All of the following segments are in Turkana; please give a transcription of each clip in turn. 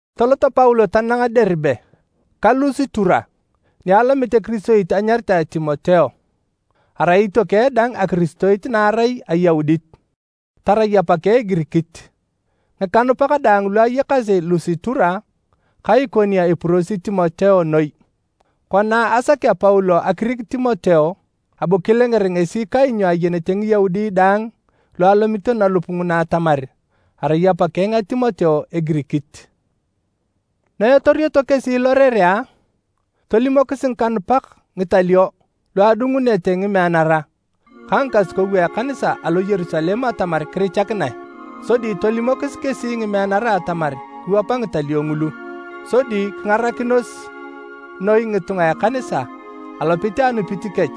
Tolot Paulo tanang Deribe ka Lusitura ni alomit ekiristoit anyaritae Timoteo. Arai itiokeng dang akiristoit na arai Ayaudit, tarai apakeng Egirikit. Ngikanupak daang lu ayakasi Lusitura ka Ikonio epurosi Timoteo noi. Kona asakea Paulo akirik Timoteo, abu kilenger ngesi kainyo ayenete Ngiyaudi daang lu alomito nalup nguna atamar arai apakeng a Timoteo Egirikit. Na etorioto kesi lorerea, tolimokis ngikanupak ngitalio lu adungunete ngimeanara ka ngikasukou a ekanisa alo Yerusalem atamar kirichakinae, sodi tolimokis kesi ngimeanara atamar kiwapa ngitalio ngulu. Sodi kingarakinos noi ngitunga a ekanisa alopit a anupit kech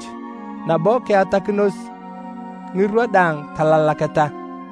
nabo kiatanakinos ngirwa daang talalaketa.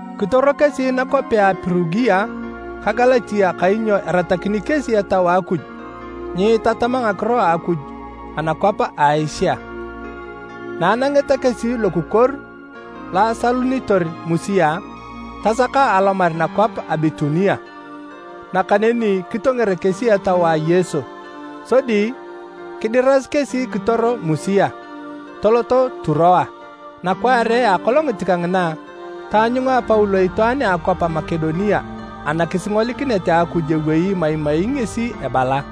Kitoro kesi nakwapea a Pirugia ka Galatia kainyo eratakini kesi Etau a Akuj nyiitatam ngakiro a Akuj anakwap a Asia. Na anangeta kesi lokukuor lo asalunitor Musia, tasaka alomar nakwap a Bitunia. Nakaneni kitonger kesi Etau a Yesu. Sodi kidirasi kesi kitoro Musia, toloto Turoa. Nakwaare a akolongit kangina, taanyunga Paulo itwaan a akwap a Makedonia anakisingolikinet a Akuj ewei imaimai ngesi ebala,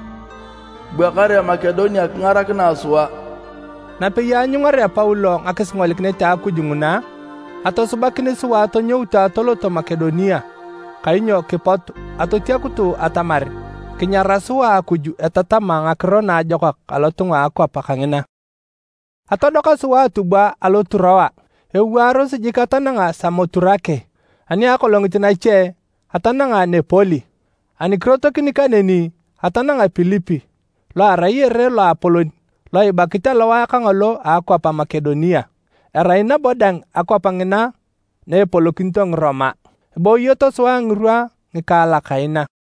“Bua kare Makedonia kingarakinae sua!” Napei aanyungarea Paulo ngakisingolikinet a Akuj nguna, atosubakin sua atonyoutu atoloto Makedonia kainyo kipotu atotiakutu atamar kinyara sua Akuj etatama Ngakiro Naajokak alotunga a akwap kangina. Atodoka sua atubwa alo Turoa ewaaros jik atananga Samoturake. Ani akolongit nache, atananga Nepoli. Ani kirotokini kaneni, atananga Pilipi lo erai ere loapolon lo ibakit alowae kangolo a akwap a Makedonia. Erai nabo dang akwap ngina na epolokinito Ngiroma. Eboyoto sua ngirwa ngikaalak kaina.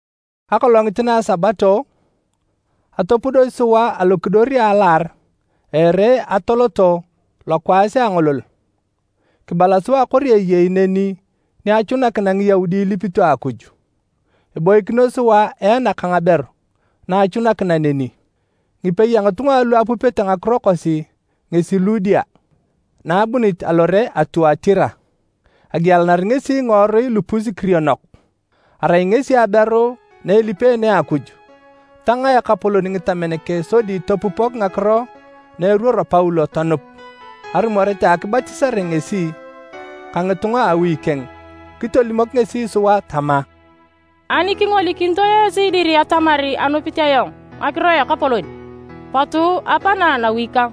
Akolongit na a Sabato, atopudosi sua alokidor a alaar a ere atoloto lokwaas a angolol. Kibala sua kori eyei neni ni achunakina Ngiyaudi ilipito Akuj. Eboikinos sua eana ka ngaberu na achunakina neni. Ngipei a ngitunga alu apupete ngakiro kosi ngesi Ludia na abunit alore a Tuatira. Agielanari ngesi ngiworui lupus-kirionok. Arai ngesi aberu na elipeene Akuj. Tangaa Ekapolon ngitamen keng sodi topupok ngakiro na eruoro Paulo tonup. Arumoret a akibatisare ngesi ka ngitunga a awi keng, kitolimok ngesi sua tama, “Ani kingolikinito esi dir atamar anupit ayong Ngakiro a Ekapolon, potu apana nawi kang.”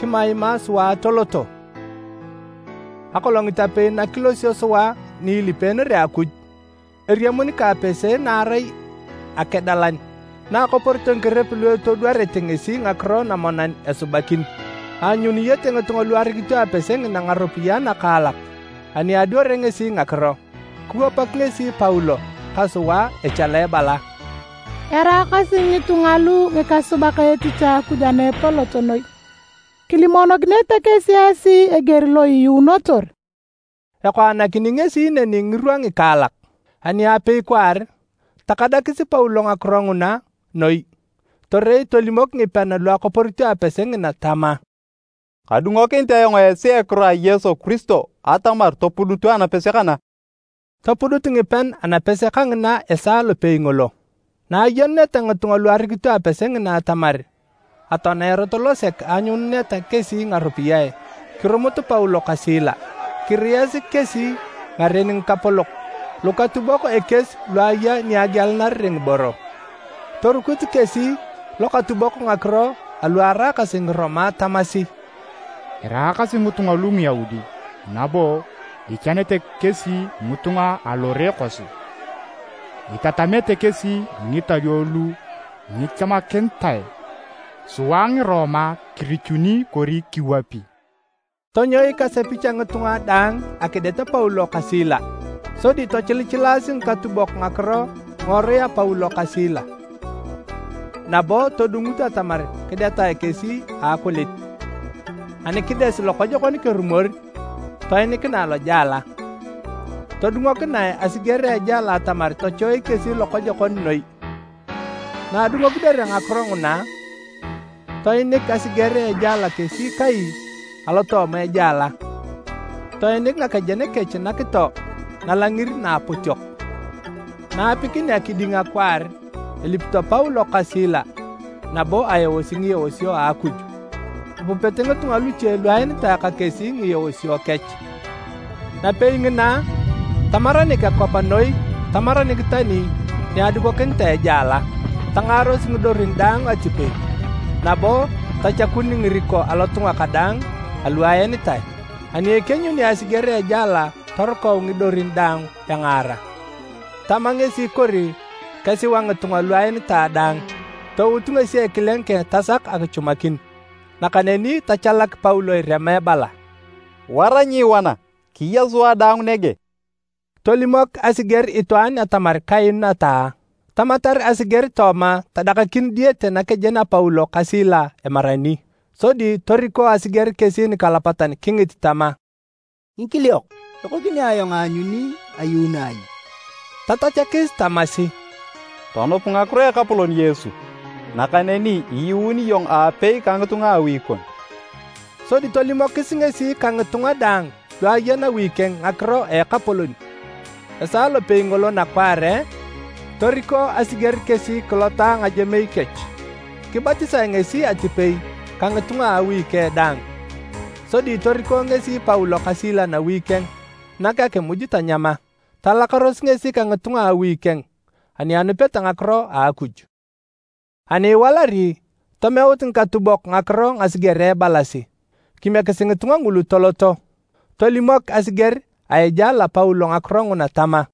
Kimaima sua atoloto. Akolongit apei na kilosio sua ni ilipeenere Akuj, eriamun ka apese na arai akedalan na akoporito ngikerep lu etodwarete ngesi ngakiro namonan esubakin. Aanyuniyete ngitunga lu arikito apese ngina ngaropiyae nakaalak ani adwarea ngesi ngakiro. Kiwapak ngesi Paulo ka sua echala ebala, “Eraakasi ngitunga lu ngikasubak etich a Akuj ana Epolot Noi! Kilimonokinete kesi esi eger lo iyuunotor!” Ekoanakini ngesi neni ngirwa ngikaalak. Ani apei kwaar, takadakis Paulo ngakiro nguna noi torei tolimok ngipean lu akoporito apese ngina tama, “Kadungokinit ayong esi a ekiro a Yesu Kiristo atamar topudutu anapese kana!” Topudut ngipean anapese kangina esaa lopei ngolo. Na ayenuneta ngitunga lu arikito apese ngina atamar atoania erot losek aanyununeta kesi ngaropiyae, kirumut Paulo ka Sila. Kiriyasi kesi ngaren ngikapolok lukatubok ekies lu aya ni agielanarere ngiboro. Torikut kesi lokatubok ngakiro alu araakasi Ngiroma tamasi, “Eraakasi ngitunga lu Ngiyaudi nabo ichanete kesi ngitunga alore kosi. Itatamete kesi ngitalio lu nyikichamakinitae sua Ngiroma kirichuni kori kiwapi.” Tonyoik asepich a ngitunga daang akidet Paulo ka Sila. Sodi tochilichilaasi ngikatubok ngakiro ngiworui a Paulo ka Sila nabo todungut atamar kidetae kesi a akulit. Ani kides lokojokon kerumor, toinikinae lojela. Todungokinae asiger a ejela atamar tochoik kesi lokojokon noi. Na adungokinere ngakiro nguna, toinik asiger a ejela kesi kai na alotooma ejela. Toinik ngakejen kech nakito nalangir naapotiok. Na aapikinea kiding akwaar, elipito Paulo ka Sila nabo aeosi ngieosio a Akuj. Apupete ngitunga luche lu aenitae ka kesi ngieosio kech. Napei ngina, tamaranik akwap noi tamaranik tani ni adukokinitae ejela. Tangaaros ngidorin daang atipei nabo tachakun ngiriko alotunga kadaang alu aenitae. Ani ekienyuni asiger a ejela torukau ngidorin daang engaara, tama ngesi kori kesiwa ngitunga lu aenitae daang. Tout ngesi ekileng keng tasak akichumakin. Nakaneni tachalak Paulo irema ebala, “Wara nyiiwana! Kiya sua daang nege!” Tolimok asiger itwaan atamar kainu ataa. Tamatar asiger tooma tadakakin diyete nakejen a Paulo ka Sila emarani. Sodi toriko asiger kesi nikalapatan kingit tama, “Ngikiliok, ekokini ayong aanyuni ayuuno ai?” Tatachakis tamasi, “Tonup ngakiro a Ekapolon Yesu, nakaneni iyuun iyong aapei ka ngitunga a awi kon.” Sodi tolimokis ngesi ka ngitunga daang lu aya nawi keng Ngakiro a Ekapolon. Esaa lopei ngolo nakwaare, toriko asiger kesi kilota ngajemei kech. Kibatisae ngesi atipei ka ngitunga a awi keng daang. Sodi toriko ngesi Paulo ka Sila nawi keng nak akimuj tanyama. Talakaros ngesi ka ngitunga a awi keng ani anupeta ngakiro a Akuj. Ani iwalari, tomeut ngikatubok ngakiro ngasigerea ebalasi, “Kimiekisi ngitunga ngulu toloto.” Tolimok asiger a ejela Paulo ngakiro nguna tama,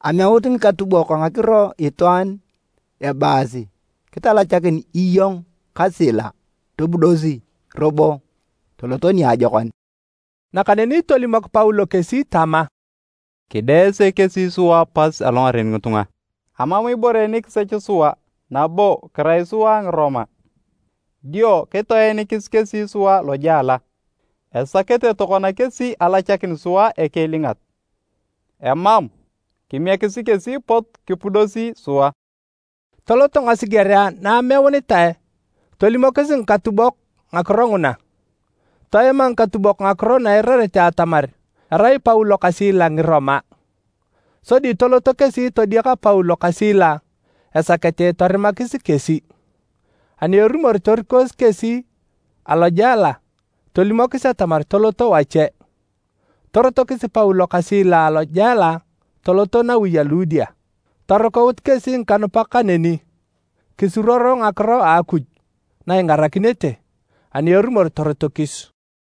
“Ameut ngikatubok ngakiro itwaan ebaasi kitalachakin iyong ka Sila. Topudosi robo toloto niajokon.” Nakaneni tolimok Paulo kesi tama, “Kideese kesi sua pas alongaren ngitunga. Amam ibore nikisech sua nabo kirai sua Ngiroma. Dio kitoenikis kesi sua lojela. Esakete tokona kesi alachakin sua ekiilingat. Emam! Kimiekisi kesi pot kipudosi sua.” Toloto ngasigerea na ameunitae tolimokis ngikatubok ngakiro nguna. Toema ngikatubok ngakiro na eirareta atamar erai Paulo ka Sila Ngiroma. Sodi toloto kesi todiaka Paulo ka Sila esakete torimakis kesi. Ani erumor torikosi kesi alojela tolimokis atamar toloto wache. Torotokis Paulo ka Sila alojela toloto nawi a Ludia. Torukaut kesi ngikanupak kaneni, kisuruoro ngakiro a Akuj na ingarakinete, ani erumor torotokis.